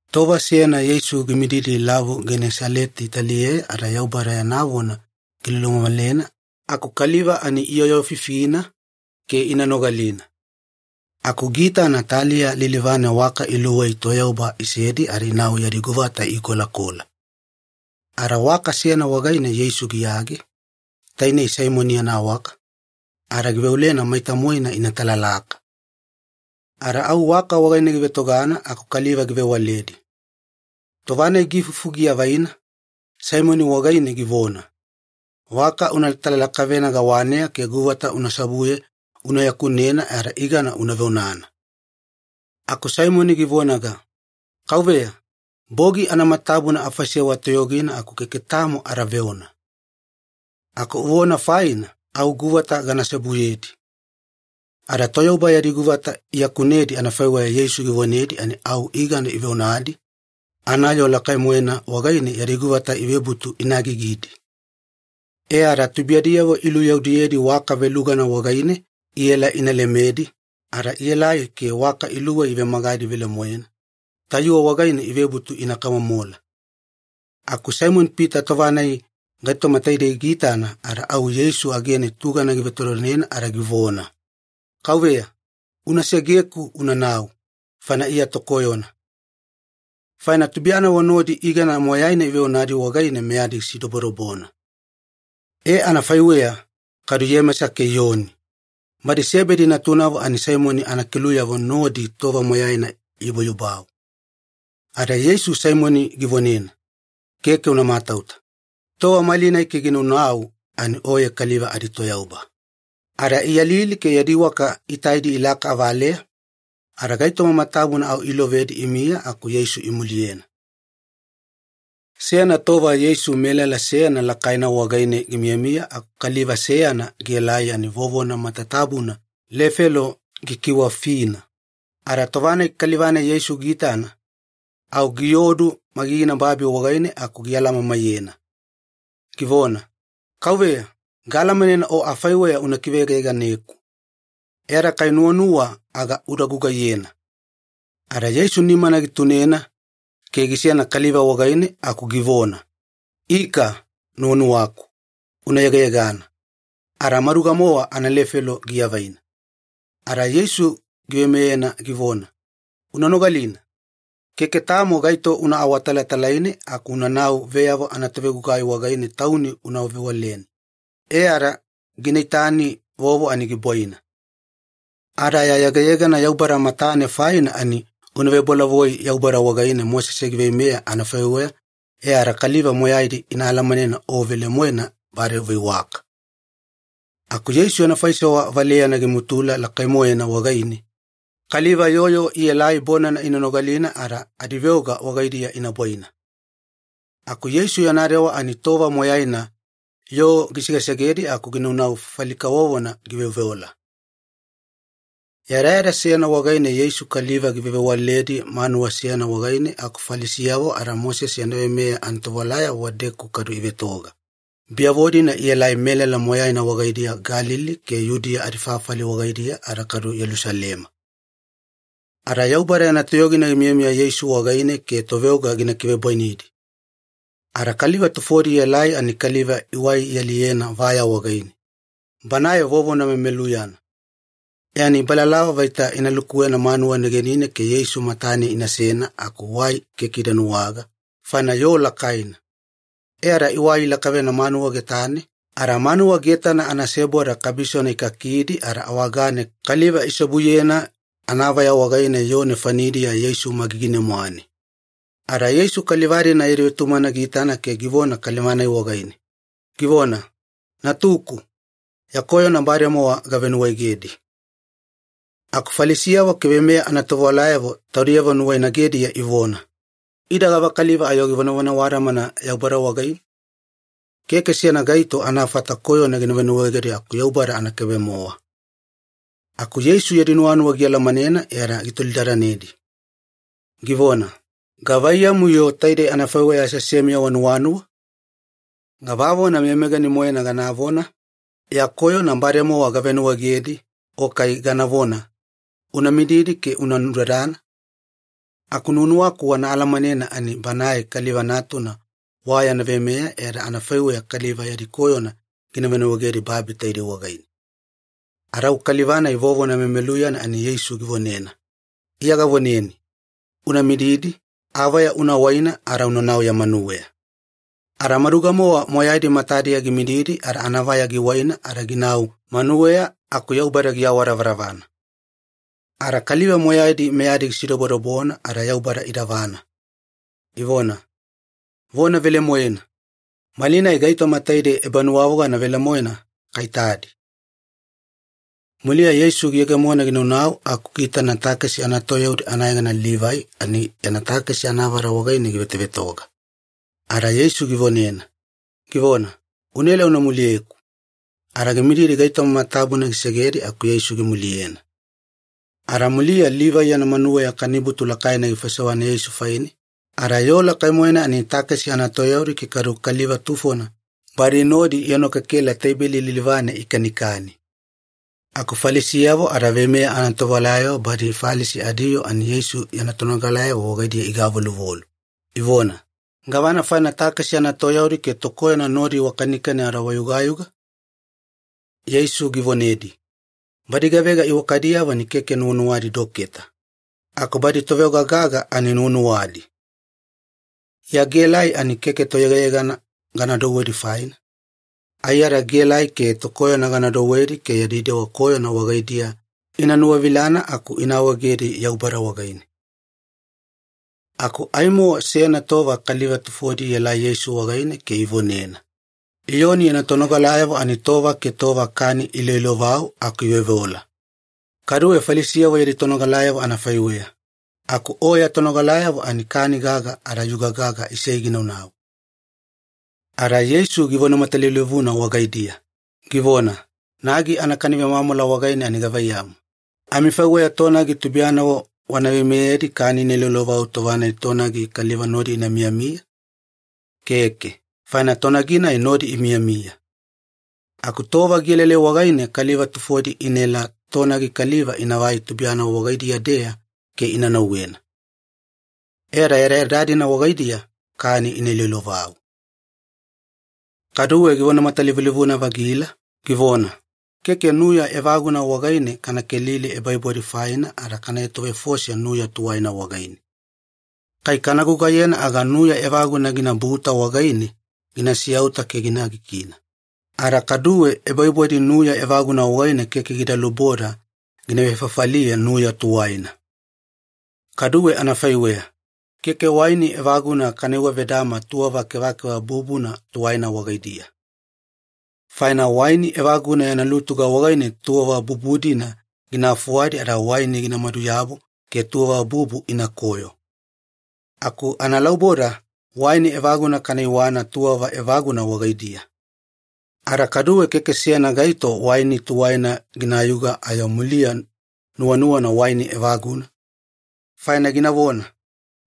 Tova seyana Yeisu gimididi Lavu Genesaleti taliyeya ada Yaubada yana vona gilulumamalena aku kaliva ani iyooyoofifina ke ina nogalina. Aku giitana taliya lilivane waka iluwei toyauba isedi ada inau yadi guvata iikolakola. Ada waka seyana wagaine Yeisu giyage, tainei Saimoni yana waka, ada giveolena maita-moena ina talalaka. Ada au waka wagaine givetogana aku kaliva givewaledi. Tova-nai giifufu giavaina, Saimoni wagaine givona, “Waka una talalakavena gawaneya ke guvata una seobuye una yakunena ada igana una veonana.” Aku Saimoni givonaga, “Kauveya, bogi anamatatabuna afaisewa toyogina, aku keke tamo ada veona. Aku uvona faina au guvata gana seobuyedi.” Ada toyauba yadi guvata iyakunedi anafaiweya Yeisu givonedi ani au igana iveonadi, anayoo lakai-moena wagaine yadi guvata ivebutu ina agigidi. E ada tubuiyadiyavo iluyaudiyedi waka velugana wagaine inaela ina lemedi, ada ielai ke waka iluwei ivemagadi velemoena, tayuwe wagaine ivebutu ina kamomola. Aku Saimoni-Pita tova-nai gaitoma taidei giitana ada au Yeisu agene tugana givetodonena ada givona, “Kauveya, una segeku unanau, faina Iya tokoyona.” Faina tubuiyanavo nodi igana moyaina iveonadi wagaine meyadi gisidobodobona. E, anafaiweya kadu Iyemesa ke Iyoni, badi Sebedi natunavo ani Saimoni anakeluyavo nodi tova moyaina iyubayubau. Ada Yeisu Saimoni givonena, “Keke una matauta. Tova malinai ke gina naunau ani oye kaliva aditoyauba.” Ada iyalili ke yadi waka itaidi ilaka avaleya, ada gaitoma matatabuna au ilovedi imiya aku Yeisu imuliyena. Seyana tova Yeisu melala seyana lakaina wagaine gimiyamiya aku kaliva seyana gielai ani vovona matatabuna lefelo gikiwafina. Ada tova-nai kaliva-nai Yeisu giitana, au giodu magigina babi wagaine aku gialamamaiyena, givona, “Kauveya, gaalamanena O afaiweya una kiveyegayeganeku. E ada kai nuwanuwa aga uda gugaiyena.” Ada Yeisu nimana gitunena ke gisena kaliva wagaine aku givona, “Ika, nuwanuwaku. Una yegayegana.” Ada maduga-mowa analefelo giavaina. Ada Yeisu giveimeyena givona, “Una nogalina. Keke tamo gaito una awatalatalaine aku unanau veyavo anatovegugai wagaine tauni una vewaleni, e ada gina itani vovo ani gibwaina. Ada ya yegayegana Yaubada matane faina ani una vebolavoi Yaubada wagaine Mosese giveimeya anafaiweya e ada kaliva moyaidi ina alamanena o velemoena bade uveiwaka.” Aku Yeisu yana faisewa valeyana gimutula lakai-moena wagaine, kaliva yoo yoo ielai bonana ina nogalina ada adiveoga wagaidiya ina bwaina. Aku Yeisu yana dewa ani tova moyaina yoo gisegesegedi aku ginaunau fafali kavovona giveoveola. Yadayada seyana wagaine Yeisu kaliva givewavewaledi manuwa seyana wagaine aku Falisiyavo ada Mosese yana veimeya anatovewalayavo wadedeku kadu ivetoga, biyavo-dina ielai melala moyaina wagaidiya Galili ke Yudiya adifafali wagaidiya ada kadu Yelusalema. Ada Yaubada yana toyogina gimiyamiya Yeisu wagaine ke toveoga gina kivebwainidi. Ada kaliva tufodi ielai ani kaliva iwai ialiyena vaya wagaine, banae vovona memeluyana. E ani ibalalava vaita ina lukuwena manuwa negenine ke Yeisu matane inasena aku wai keke ida nuwaga, faina yoo lakaina. E ada iwai ilakavena manuwa getane ada manuwa getana anaseboda kabisona ikakidi ada awagane kaliva iseobuyena anavaya wagaine yoo nefanidiya Yeisu magigine-mwane. Ada Yeisu kaliva-dina yadi vetumagana giitana ke givona kaliva-nai wagaine, givona, “Natuku, ya koyona bademowa gavenuwaegedi.” Aku Falisiyavo ke veimeya anatovewalayavo taudiyavo nuwainagediya ivona, “Ida gavakaliva ayo givonavona awadamana Yaubada wagaine? Keke seyana gaito anafata koyona gina venuwaegedi aku Yaubada anakaibe-mowa.” Aku Yeisu yadi nuwanuwa gialamanena e ada gitolidadanedi, givona, “Gavaiyamu-yo taidei anafaiweya aseasemiya wanuwanuwa? Gavavona meyameyagani-moena ganavona, ‘Ya koyona bademowa gavenuwaegedi’ o kai ganavona, ‘Una mididi ke una nudadana’? Aku nuwanuwaku wana alamanena ani Banae Kaliva Natuna wa yana veimeya e ada anafaiweya kaliva yadi koyona gina venuwaegedi babi taidei wagaine.” Ada au kaliva-nai vovona memeluyana ani Yeisu givonena, “Iya gavoneni, una mididi, avaya una waina ada unanau ya manuweya.” Ada maduga-mowa moyaidi matadiya gimididi ada anavaya giwaina ada ginau manuweya aku Yaubada giawadavadavana. Ada kaliva moyaidi meyadi gisidobodobona ada Yaubada idavana, ivona, “Vona velemoena! Malinai gaitoma taidei ebanuwavogana velemoena kaitadi.” Muliya Yeisu giyegemona ginaunau aku giitana takesi anatoyaudi anayegana Livai ani yana takesi anavada wagaine givetovetoga. Ada Yeisu givonena, givona, “Unaela una muliyeku.” Ada gimididi gaitoma matatabuna gisedi aku Yeisu gimuliyena. Ada muliya Livai yana manuweya kanibutu lakaina gifaisewana Yeisu faine, ada yoo lakai-moena ani takesi anatoyaudi ke kaduwe kaliva tufona badi nodi ienokekela teibeli lilivane ikanikani. Aku Falisiyavo ada veimeya anatovewalayavo badi Falisi adiyoo ani Yeisu yana tonogalayavo wagaidiya igavoluvolu, ivona, “Gavana faina takesi anatoyaudi ke tokoyona nodi wakanikani ada wayugayuga?” Yeisu givonedi, “Badi gavega iwakadiyavo ani keke nuwanuwadi doketa, aku badi toveoga gaga ani nuwanuwadi. Iya gaelai ani keke toyegayegana gana douwedi faina. Aiyada gaelai ke tokoyona gana douwedi ke yadi dewa koyona wagaidiya ina nuwavilana aku ina awaegedi Yaubada wagaine.” Aku aimo seyana tova kaliva tufodi ielai Yeisu wagaine ke ivonena, “Iyoni yana tonogalayavo ani tova ke tova kani iiloilovau aku iveoveola, kaduwe Falisiyavo yadi tonogalayavo anafaiweya, aku O ya tonogalayavo ani kani gaga ada yuga gaga isei ginaunau.” Ada Yeisu givona matalivulivuna wagaidiya, givona, “Nagi anakani vemwamwala wagaine ani gavaiyamu, amifaiweya tonagi tubuiyanavo wana veimeyedi kani ina iloilovau tova-nai tonagi kaliva nodi ina miyamiya? Keke, faina tonagi-nai nodi imiyamiya. Aku tova gielaelai wagaine kaliva tufodi inaela tonagi kaliva inavai tubuiyanavo wagaidiya-deya ke ina nauwena. E ada yadayada-dina wagaidiya kani ina iloilovau.” Kaduwe givona matalivulivuna-vagila, givona, “Keke nuya evaguna wagaine kana kelili ebaibwadi faina ada kana etovefose nuya tuwaina wagaine. Kai kana gugaiyena aga nuya evaguna ginabuta wagaine gina siyauta ke gina agigina, ada kaduwe ebaibwadi nuya evaguna wagaine keke gida luboda gina vefafaliye nuya tuwaina. Kaduwe anafaiweya, keke waini evaguna kana iwavedama tuwava kevakeva bubuna tuwaina wagaidiya. Faina waini evaguna yana lutuga wagaine tuwava bubu-dina gina fuwadi ada waini gina maduyabu ke tuwava bubu inakoyo. Aku analauboda waini evaguna kana iwana tuwava evaguna wagaidiya. Ada kaduwe keke seyana gaito waini tuwaina ginayuga ayo muliya nuwanuwana waini evaguna, faina ginavona,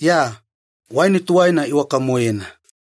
‘Ya! Waini tuwaina iwaka-moena.’”